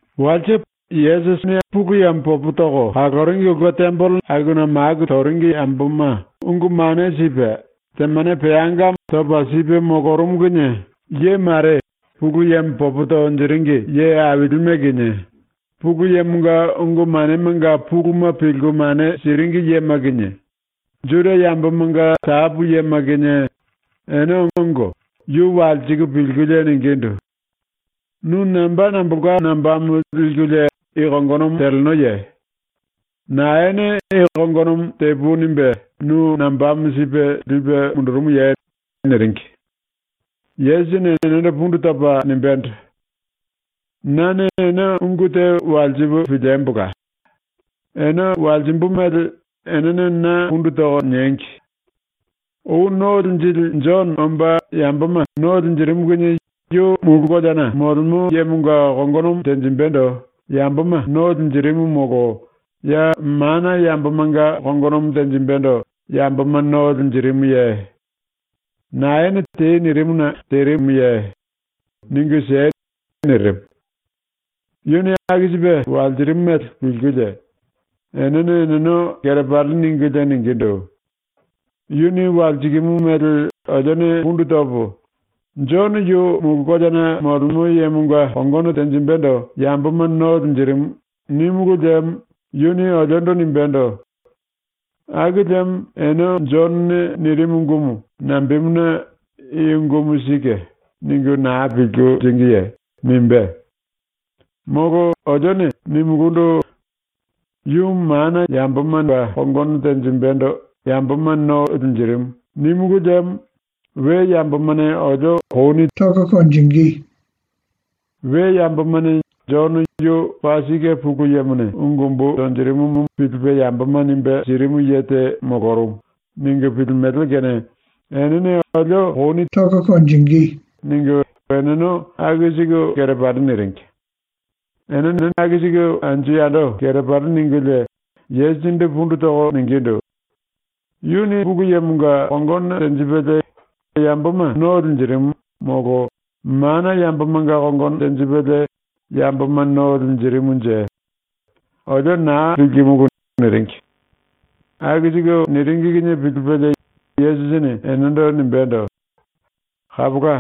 Walse ⸤Pulu Yemo popo toko kaloringi⸥ ulke tembelena Yesusi akuna maku toringi yamboma ungu mane sipe, temane peangamo topa sipe molorumu kinie ye mare, Pulu Yemo popo tonjiringi ye ailime kinie, Pulu Yemonga ungu manemanga puluma pilku mane siringi yema kinie, Juda yambomanga tapu yema kinie, ene ongo yu walsiku pilkulie ningindu: “Nu namba nambolka nambamo likulie i kongonomo telenoye? Naene i kongonomo “Tepui.” nimbe nu nambamo sipe lipe mundurumuye?” niringi. Yesusini enendo pundu topa nimbendo: “Nane ene ungu te walsipu piliembola. Ene walsimbu mele enene na pundu toko niengi. Ou ⸤No Linjili⸥ Jono omba yamboma no linjirimu kinie yu mulu koleana ⸤molemo yemonga⸥ kongonomo tenjimbendo yamboma no linjirimu molo ya mana yambomanga kongonomo tenjimbendo yamboma no linjirimuye? ⸤Naene “Tei.” nirimuna terimuye? Ningu siei.⸥” nirimu. ⸤Yuni aku sipe walsirimu mele pilkulie⸥ enene eneno kerepali ningulie ningindu: “Yuni walsikimu mele olione pundu topo, “⸤Jono⸥ yu mulu koleana ⸤molemo yemonga kongono tenjimbendo yamboma no linjirimu⸥.” nímulu liemo yuni oliondo nimbendo: “Aku liemo ene Jonone nirimu ungumu nambemuna ‘I ungumu sike.’ ningu naa pilku liringiye?” nimbé. Molo olione nimulundu: “Yu mana yambomanga ⸤kongono tenjimbendo yamboma no linjirimu⸥.” nímulu liemo we yambomane olio kouni tonge. We yambomane ‘Jono yu paa sike Pulu Yemone ungu umbu tonjirimumu pilipe yamboma nimbe sirimu ye te molorumu.’ ningu pilimele kene enene olio kouni tonge.” ningu eneno aku siku kerepali niringi. ⸤Eneno aku siku anju yando kerepali ningulie⸥, Yesusindu pundu toko ningindu: “Yuni Pulu Yemonga kongono tenjipelie yamboma no linjirimu, molo mana yambomanga kongono tenjipelie yamboma no linjirimunje. Olio naa pilkimulu.” niringi. Aku siku niringi kinie pilipelie Yesusini enendo nimbendo: “Kapola.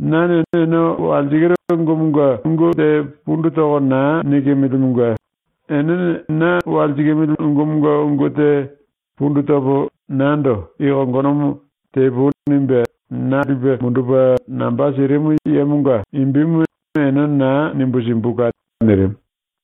⸤Nane ene walsikiru ungumunge ungu te pundu toko naa nikimilimunge⸥ enene na walsikimili ungumunge ungu te pundu topo nando i kongonomo ‘Tepui.’ nimbe na lipe mundupe namba sirimu yemonga imbimu ene naa nimbu simbula.” nirimu.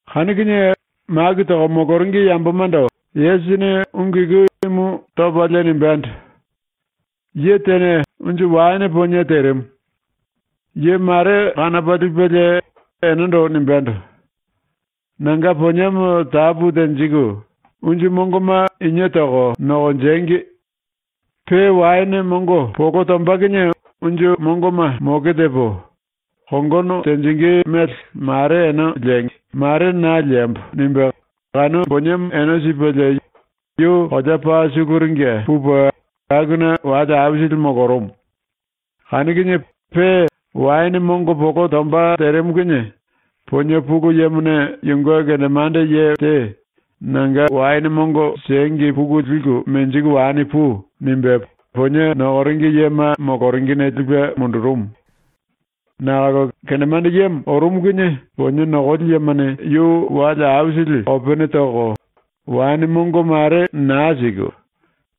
Kanu kinie maku toko moloringi yambomando Yesusini ungu iku imu topalie nimbendo: “Ye tene unju waene ponie terimu. Ye mare kanopa lipelie enendo nimbendo: “Nanga poniemo tapu tenjiku unju mongoma inie toko nokonjengi. Pe waene mongo polo tomba kinie unju mongoma moke tepo, kongono tenjingí mele mare ene liengi, mare na liembo.” nimbe kanu poniemo ene sipelie yu kolea paa suluringe pupe akuna wale aisili molorumu. Kanu kinie pe waene mongo polo tomba terimu kinie ponie pulu yemone yunge kendemande ye te “Nanga waene mongo siengi puku liku menjiku wani pui.” nimbe ponie nokoringi yema moloringine lipe mundurumu. Nakolo kendemande yemo ⸤orumu kinie⸥ ponie nokoli yemane yu wale aisili kopene toko, waene mongo mare naa siku,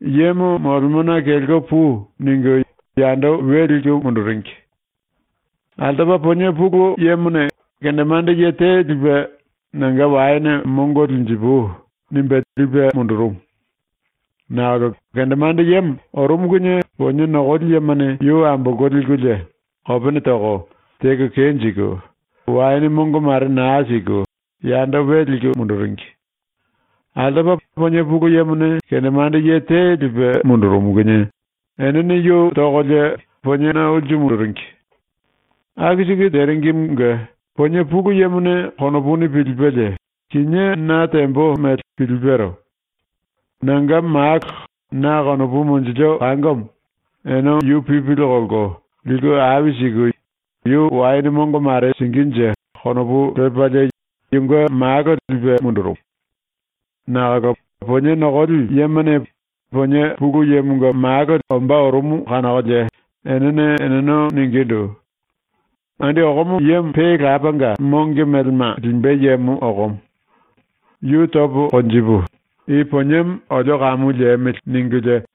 ⸤“Yemo molemona kelko pui.” ningu⸥ yando we liku munduringi. Altopa ponie pulu yemone kendemande ye te lipe ⸤“Nanga waene mongo linjipui.” nimbe lipe⸥ mundurumu. Nakolo kendemande yemo ⸤orumu kinie⸥ ponie nokoli yemane yu ambolko likulie kopene toko, teko kenjiku, waene mongo mare naa siku yando we liku munduringi. Altopa ponie pulu yemone kendemande ye te lipe mundurumu kinie enene yu tokolie poniena ulsu munduringi. Aku siku teringimunge ponie pulu yemone ⸤konopuni pilipelie⸥ ‘Kinié na tembo mele pilipero. Nanga malo, na konopu monjilio kangomo, ene yu pipili kolko liku ai siku yu waene mongo mare singínje.’ konopu lepalie ⸤yunge malo lipe mundurumu⸥. Nakolo ponie nokoli yemane ponie pulu yemonga malo ombá orumu kanokolie enene eneno ningindu: “Andi okomo yemo pe lapanga monge melema limbe yemo okomo. Yu topo konjipu, i poniemo olio kamu liemili.” ningulie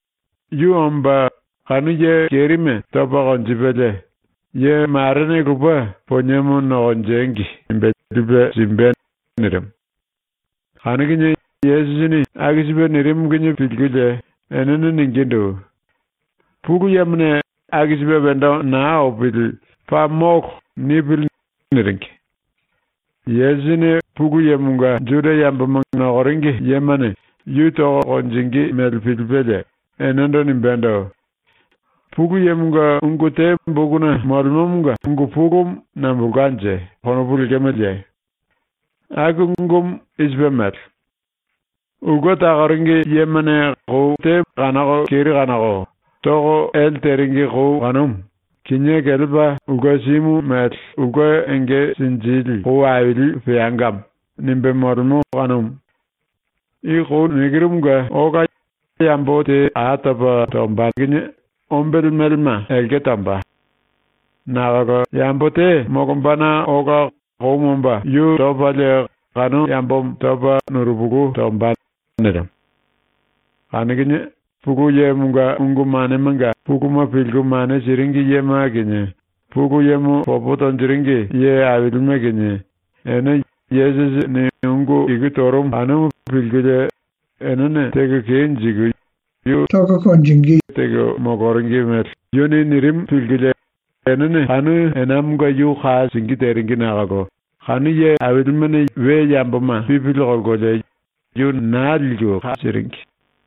Yu omba kanu ye kerime topa konjipelie ‘Ye marene lupe poniemo nokonjengi.’ nimbe lipe simbe.” nirimu. Kanu kinie Yesusini aku sipe nirimu kinie pilkulie enene ningindu: “Pulu Yemone ‘Aku sipe wendo naa opili, paa molo!’ nipili.” niringi. Yesusini ⸤Pulu Yemonga Juda yamboma nokoringi yemane yu toko konjingí mele pilipelie⸥ enendo nimbendo: “Pulu Yemonga ungu te bokuna molemomonga ungu pulumu nambolkanje konopu lemeleye? Aku ungumu i sipe mele: ‘Ulke takoringi yemane kanoko keri kanoko toko ele teringi kou kanumu kinié kelepa ulke simu mele ulke enge sinjili kou aili peangamo.’ nimbe molemo kanumu. I kou ⸤nikiru⸥ munge ola yambo te a topa topalie ombele melema elke tomba. Nakolo yambo te molombana ola koumu omba yu topalie kanu yambomo topa nurupulu tomba.” nirimu. Kanu kinie Pulu Yemonga ungu manemanga puluma pilku mane siringi yema kinie, Pulu Yemo popo tonjiringi ye ailime kinie, ene Yesusini ungu iku torumu kanumu pilkulie enene teko kenjiku yu tonge teko moloringi mele yuni nirimu pilkulie enene kanu enamonga yu ka singí teringi nakolo kanu ye ailimene we yamboma pipili kolkolie yu naa liku ka siringi.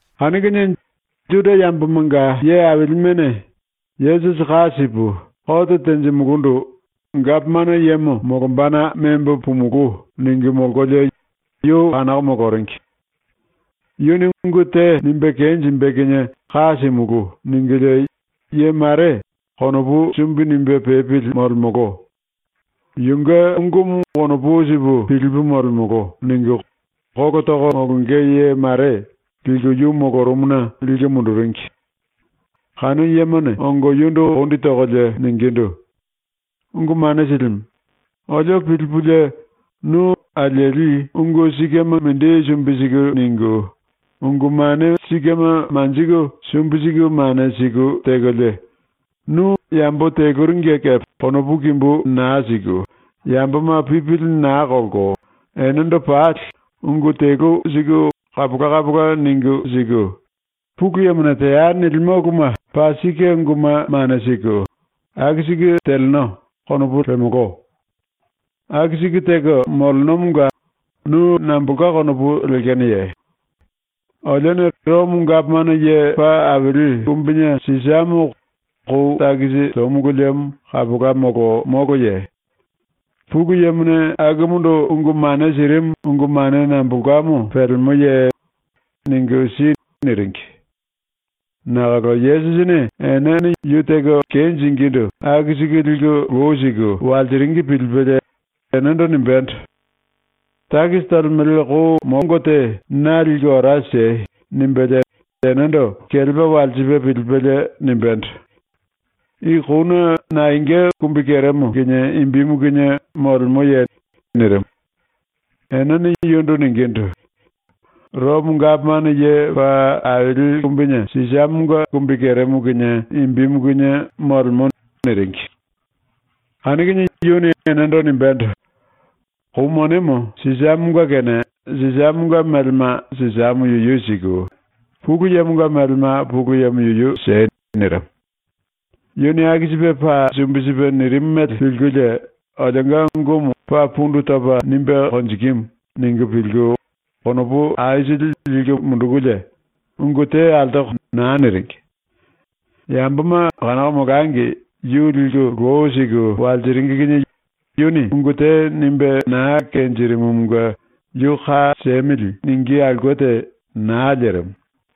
Kanu kinie ⸤Juda yambomanga ye ailimene⸥ ‘Yesusi ka sipu ⸤kote tenjimulundu⸥ gapomano yemo molombana membo pumulú.’ ningu molkolie yu kanoko moloringi. ‘Yuni ungu te nimbe kenjimbe kinie ka simulú.’ ningulie ye mare, ‘Konopu sumbi nimbe pepili molemolo. Yunge ungumu konopu sipu pilipu molemolo.’ ningu kolo toko molonge ye mare, liku yu molorumuna liku munduringi. Kanu yemane ongo yundu ⸤kondi tokolie⸥ ningindu: “Ungu Mane Silimu, olio pilipulie, ‘Nu alieli ungu sikema mindi sumbi siku ningu, ungu mane sikema manjiku sumbi siku mane siku tekolie, nu yambo teluringe kepe konopu kimbú naa siku, yamboma pipili naa kolko, enendo pali ungu telu siku kapola kapola ningu siku, Pulu Yemone “Teai.” nilimo uluma paa sike unguma mane siku, aku siku teleno.’ konopu lemolo. ⸤Aku siku teko molenomonga nu nambolka konopu lekenoye?⸥ Olione Romo Gapomano Ye Paa Aili Kumbine Sisamo kou takisi tomulu liemo kapola molo moloye? Pulu Yemone akumundu ungu mane sirimu ungu mane nambolkamo pelemoye? Ningu si.” niringi. Nakolo Yesusini enene yu teko kenjingindu aku siku liku lou siku walsiringi pilipelie enendo nimbendo: “⸤Takisi tolemele⸥ kou mongo te na liku ora siei.” ⸤nimbelie enendo kelepa walsipe pilipelie nimbendo:⸥ “I kouna naenga kumbikeremo kinie imbimu kinie molemoye?” nirimu. Enene yundu ningindu: “Romo Gapomano Ye Paa Aili Kumbine Sisamonga ⸤kumbikeremo kinie imbimu kinie molemo⸥.” niringi. Kanu kinie yuni enendo nimbendo: “⸤Kou monemo Sisamonga⸥ kene Sisamonga melema Sisamo yuyu siku, Pulu Yemonga melema Pulu Yemo yuyu siei.” nirimu. Yuni aku sipe ⸤paa sumbi sipe⸥ nirimu mele pilkulie ‘Olionga ungumu paa pundu topa nimbe konjikimu.’ ningu pilku konopu aisili liku mundukulie ungu te altoko naa niringi. Yamboma kanoko molangi yu liku lou siku walsiringi kinie yuni ungu te nimbe na kenjirimumunge “Yu ka siemili.” ningí aulke te naa lerimu.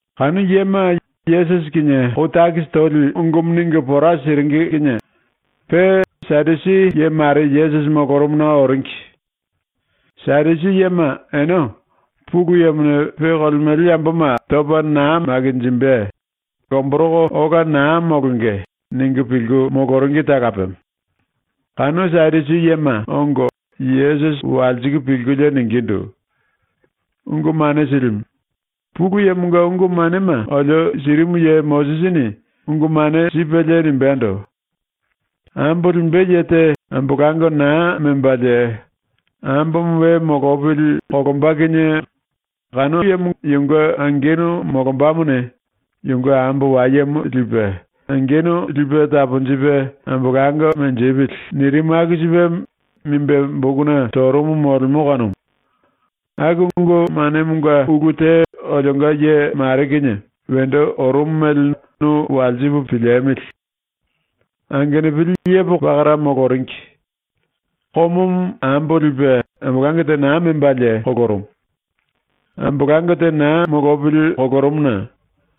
⸤Kanu yema Yesusi kinie kou takisi toli ungumu ningu pora siringi kinie⸥ pe Sadusi ye mare Yesusi molorumuna oringi. Sadusi yema ene ‘Pulu Yemone pe kolemele yamboma topa naa makinjimbe, lomboroko ola naa molonge.’ ningu pilku moloringi talapemo. Kanu Sadusi yema ongo Yesusi walsiku pilkulie ningindu: “Ungu Mane Silimu, ⸤Pulu Yemonga ungu manema olio sirimu ye⸥ Mosisini ungu mane sipelie nimbendo: “Ambo limbe ye te ambolango naa membalie ambomo we molopili kolomba kinie kanu yemo yunge angenu molombamone yunge ambo wayemo lipe angenu lipe taponjipe ambolango menjipili.” nirimu aku sipe nimbe bokuna torumu molemo kanumu. ⸤Aku ungu manemonga ulu te olionga ye mare kinie wendo orumu mele nu walsipu piliemili.⸥ “Angenupili yepoko pakara moloringi. Komomo ambo lipe ambolango te naa membalie kolorumu. ⸤Ambolango te naa molopili kolorumuna⸥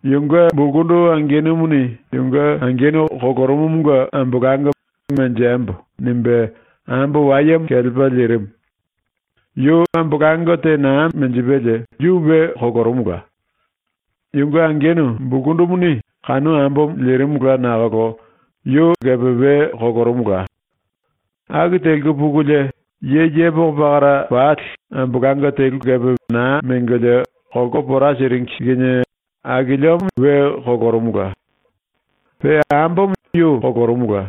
yunge bulkundu angenumuni ⸤yunge angenu kolorumumunge ambolango ‘Menjembo.’ nimbe⸥ ambo wayemo kelepa lirimu. Yu ambolango te naa menjipelie yu we kolorumula. Yunge angenu bulkundumuni kanu ambomo lirimula nakolo yu kepe we kolorumula. Aku teliku pukulie ye yepoko pakara pali ambolango telu kepe naa mengolie kolko pora siringi kinie akiliomo we kolorumula. Pe ambomo yu kolorumula.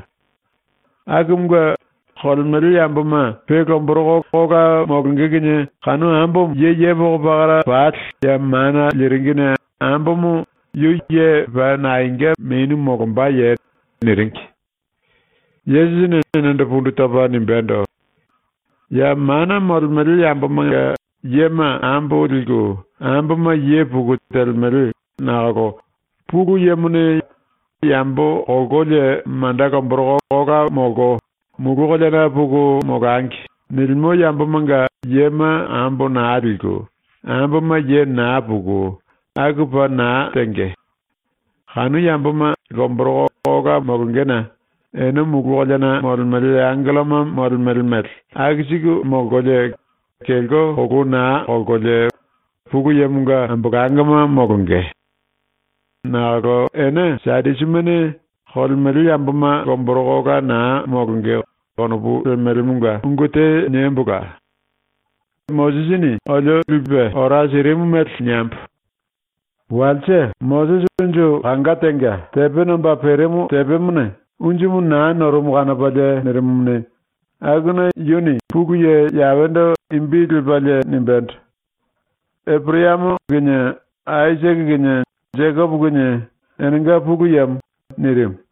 Akumunge, kolemele yamboma pe lomboroko ola molonge kinie kanu ambomo ye yepoko pakara pali ya mana liringine ambomo yu ye paa naenga menu molombaye?” niringi. Yesusini enendo pundu topa nimbendo: “Ya mana molemele yambomanga yema ambo liku, amboma ye puku telemele nakolo Pulu Yemone ‘Yambo kolkolie manda lomboroko ola molko mulu koleana puku molangi.’ nilimo yambomanga yema ambo naa liku, amboma ye naa puku, aku paa naa tenge. Kanu yamboma lomboroko ola molongena ene mulu koleana molemele angelloma molemele mele aku siku molkolie, kelko kolou naa kolkolie Pulu Yemonga ambolangoma molonge. Nakolo ⸤ene Sadusimene⸥ ‘Kolemele yamboma lomboroko ola naa molonge.’ konopu lemelemonga ungu te niembola. Mosisini olio lipe ora sirimu mele niembo: Walse Mosisi unju kanga tenga ⸤tepe nomba perimu tepemone unjumu naa norumu kanopalie nirimumuni,⸥ akuna yuni ⸤Pulu Ye⸥ Yawendo imbi lepalie nimbendo: “Eporayamo kinie, Aisake kinie, Jekopo kinie enenga Pulu Yemo.” nirimu.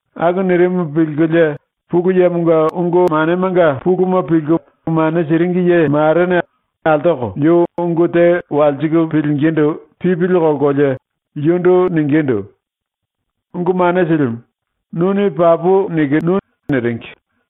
Aku nirimu pilkulie Pulu Yemonga ungu manemanga puluma pilku mane siringi ye marene altoko yu ungu te walsiku pilingindu pipili kolkolie yundu ningindu: “Ungu Mane Silimu, nuni papu nikinu.” niringi.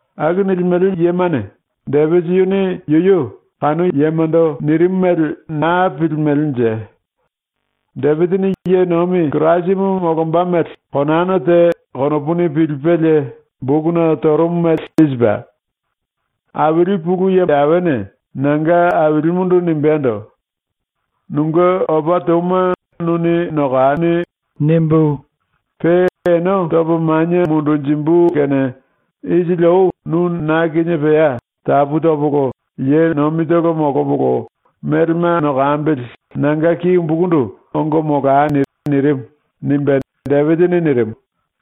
⸤Aku nilimele yemane⸥ Depisi yuni yuyu ⸤kanu yemondo nirimu mele naa pilimelenje.⸥ Depisini ⸤ye nomi Kirasimu molomba mele⸥ konana te konopuni pilipelie bokuna torumu mele i sipe: “Aili ⸤Pulu Ye Yawene⸥ nanga Ailimundu nimbendo: “‘Nunge opa touma nuni nokani.’ nimbu, pe ene topo manie mundunjimbu kene isili ou nu ⸤na kinie pea tapu topolo ye nomitolo molopolo melema nokambili⸥ nanga ki umbukundu ongo molani.” nirimu.” nimbe Depisini nirimu.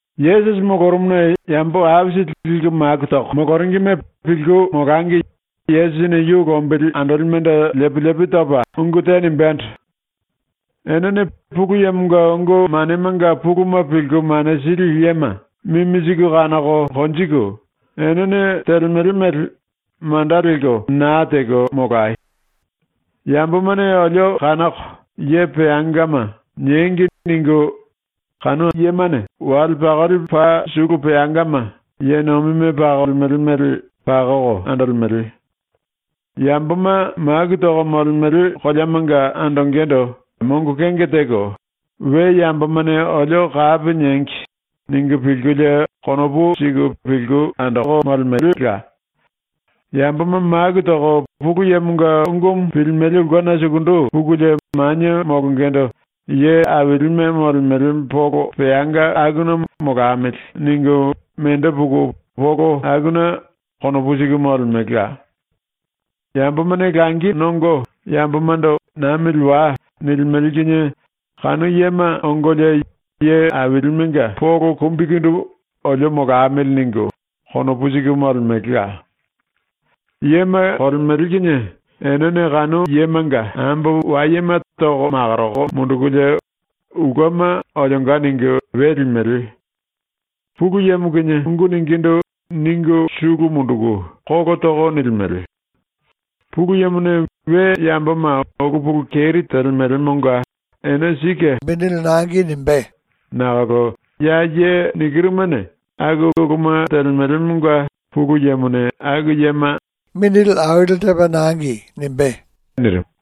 Yesusi molorumuna yambo aisili liku maku toko moloringime pilku molangi Yesusini yu lombili andolimendo ⸤lepi lepi topa⸥ ungu te nimbendo: “Enene Pulu Yemonga ungu manemanga puluma pilku mane sili yema mimi siku kanoko konjiku ⸤enene telemele mele manda lelko naa teko⸥ molayo. ⸤‘Yambomane olio kanoko “Ye peangama” niengi.’ ningu⸥ wale pakoli paa sulu peangama, ⸤ye nomime pakolemele mele,⸥ pakoko andolemele. Yamboma maku toko molemele koleamanga andongendo mongo kenge teko ‘We yambomane olio kapi niengi.’ ningu pilkulie konopu siku pilku andoko molemelela. Yamboma maku toko Pulu Yemonga ungumu pilimele ulkena sukundu pukulie manie molongendo ye ailime molemele polo peanga akuna ‘molamili.’ ningu mendo puku polo akuna konopu siku molemelela. Yambomane langi nongo yambomando “Namili wai.” nilimele kinie kanu yema ongolie ye ailimenga polo kumbikundu ‘olio molamili.’ ningu konopu siku molemelela. “Yema kolemele kinie enene kanu yemanga ambo wayema toko makoroko mundukulie ulkema ‘Olionga’ ningu we limele. Pulu Yemo kinie ungu ningindu ningu sulu munduku kolo toko nilimele. Pulu Yemone we yamboma ulu pulu keri telemelemonga ene sike mongo lipe simbe nakolo ya ye nikirumane aku uluma telemelemonga Pulu Yemone aku yema mongo aili tepa lipe simbe.” nirimu.